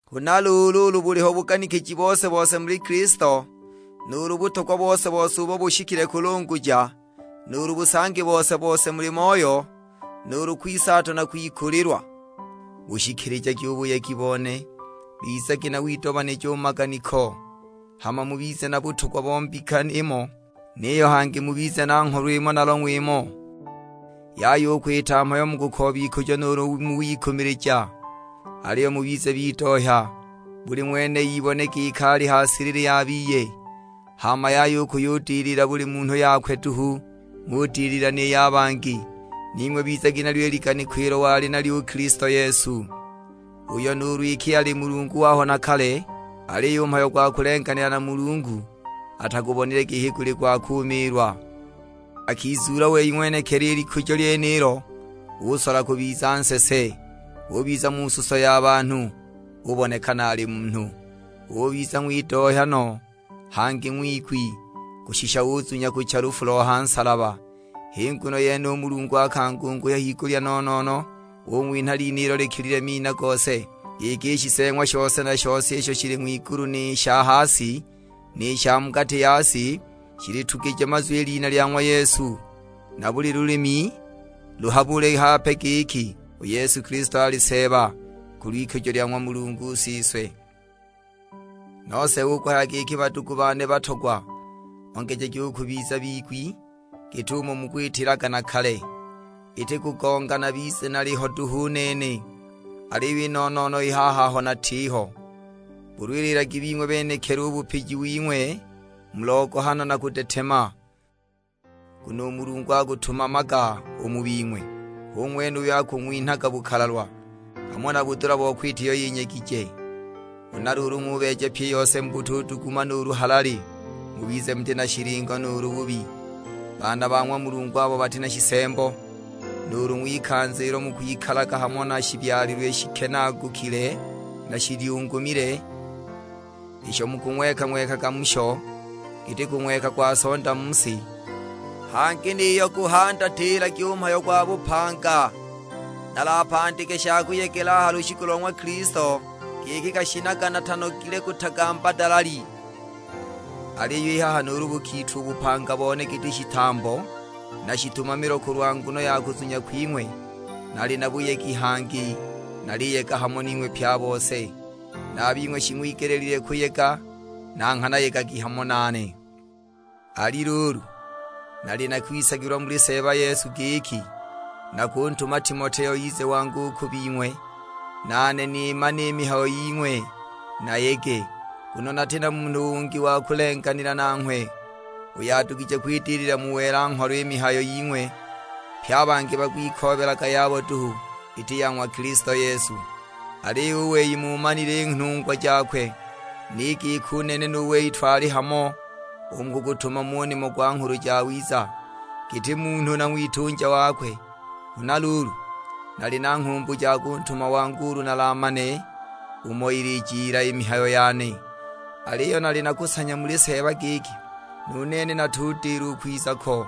Huna luulu ulu buliho buganikiji bose-bose muli Kilisto, nuulu butogwa bose-bose ubo bushikile kulunguja, nuulu busangi bose-bose muli Moyo, nuulu kwisaatwa na kwikulilwa; bushikilijagi u buyegi bone. Bizagi na widomanija u mu maganiko, hama mubize na butogwa bo mbika imo; niyo hangi mubize na ngholo imo na long'we imo. Yaya u kwita mhayo mu kukooba ikujo nuulu mu wikumilija, aliyo mubize bidohya, buli ng'wene ibone giki ali ha silili ya biye. Hama yaya kuyudilila buli munhu yakwe duhu, ng'udilila ni ya bangi. Ning'we bizagi nalyo i liganiko ilo wali nalyo u Kilisto Yesu; uyo nuulu iki ali Mulungu waho na kale, aliyo u mhayo gwa kulenganila na Mulungu atagubonile giki guli gwa kumiilwa. Akizuula wei ng'wenekili i likujo lyenilo, usola kubiza nsese, ubiza mu suso ya banhu. Ubonekana ali munhu. Ubiza ng'widohya no, hangi ng'wigwi; kushisha uzunya kucha lufu lo ha nsalaba. H'i nguno yene u Mulungu akangunguhya higulya no-no-no, ung'winha lina ilo likilile mina gose; giki i shiseeng'wa shose na shose, isho shili ng'wigulu ni sha ha si, ni sha mu gati ya si, shilitugije mazwi i lina lya ng'wa Yesu. Na buli lulimi luhabule hape giki u Yesu Kilisto ali Seeba, kulw'ikujo lya ng'wa Mulungu Siswe. Nose hu kuhaya giki badugu bane batogwa, ongejagi u kubiza bigwi, git'umo mukwitilaga na kale, iti kugonga nabize naliho duhu u nene, aliyo i no-no-no i haha aho natiho; bulwililagi bing'we benekili u bupiji wing'we, mu logohano na kudetema. Nguno u Mulungu akutumamaga u mu bing'we, hu ng'wene uyo akung'winhaga bukalalwa, hamo na budula bo kwita iyo yinyegije. Huna luulu ng'ubeeja pyi i yose mu butuduguma nuulu halali. Mubize muti na shilingo nuulu bubi, baana ba ng'wa Mulungu abo bati na shisembo, nuulu u ng'wikanza ilo mukwikalaga hamo na shibyalilwe shikenaagukile na shilyungumile; isho mukung'weka-ng'wekaga musho giti kung'weka kwa sonda mu si. Hangi niyo guhandatilagi u mhayo gwa bupanga, nalapandike sha kuyegela a ha lushiku lo ng'wa Kilisto, giki gashinaga natanogile kutagamba dalali. Aliyo i haha nuulu bukitwa u bupanga bone giti shitambo na shitumamilo kulwa nguno ya kuzunya kwing'we, nali na buyegi; hangi naliyega hamo ning'we pye a bose. Na a bing'we shing'wigeleelilwe kuyega, na nghana yegagi hamo nane. Ali luulu, nali na kwisagilwa muli Seeba Yesu giki, nakuntuma Timoteo ize wangu u ku bing'we, nane nimane i mihayo ying'we, nayege. Nguno nati na munhu ungi wa kulenganila nanghwe, uyo adugije kwidilila mu welwa-ngholo i mihayo ying'we. Pye a bangi bakwikoobelaga yabo duhu, iti ya ng'wa Kilisto Yesu. Aliyo u wei muumanile i nhungwa jakwe, ni giki u nene nu wei twali hamo u mu kugutumama u nimo gwa Nghulu Jawiza, giti munhu na ng'witunja wakwe. Huna luulu, nali na nghumbu ja kuntuma wangu ulu nalamane umo ilijila i mihayo yane. Aliyo nali na kusanya muli Seeba giki, nu nene natudila u kwiza ko.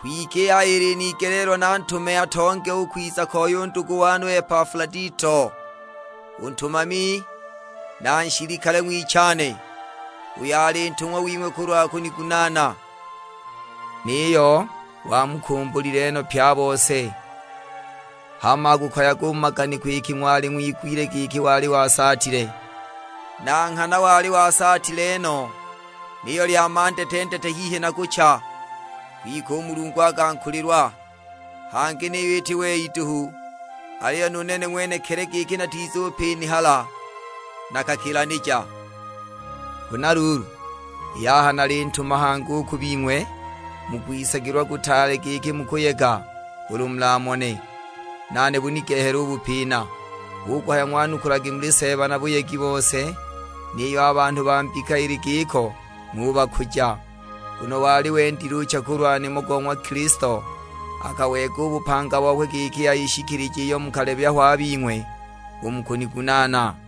Kwike i haha ilinigeleelwa nantume atonge u kwiza koi u ndugu wane u Epafuladito, u ntumami na nshilikale ng'wichane; uyo ali ntung'wa wing'we kulwa kunigunaana. Niyo wamukumbulile no pye a bose, hama akukoyaga u mu maganiko iki ng'wali ng'wigwile giki wali wasaatile. Na nghana wali wasaatile no, niyo lya mandetendete hihi na kucha, kwike u Mulungu akankulilwa, hangi niyo iti wei duhu, aliyo nu nene ng'wenekili, giki natizupinihala nakakilanija. Huna luulu, i haha nalintuma hangi u ku bing'we, mu kwisagilwa kutaale giki mukuyega ulu mulamone, nane bunigehele u bupina. Hu kuhaya ng'wanukulagi muli Seeba na buyegi bose; niyo a banhu ba mbika ili giko ng'ubakuja. Nguno wali wendil'ucha kulwa nimo go ng'wa Kilisto, akaweega u bupanga bokwe giki ayishikilije iyo mukalebya ho a bing'we u mu kunigunaana.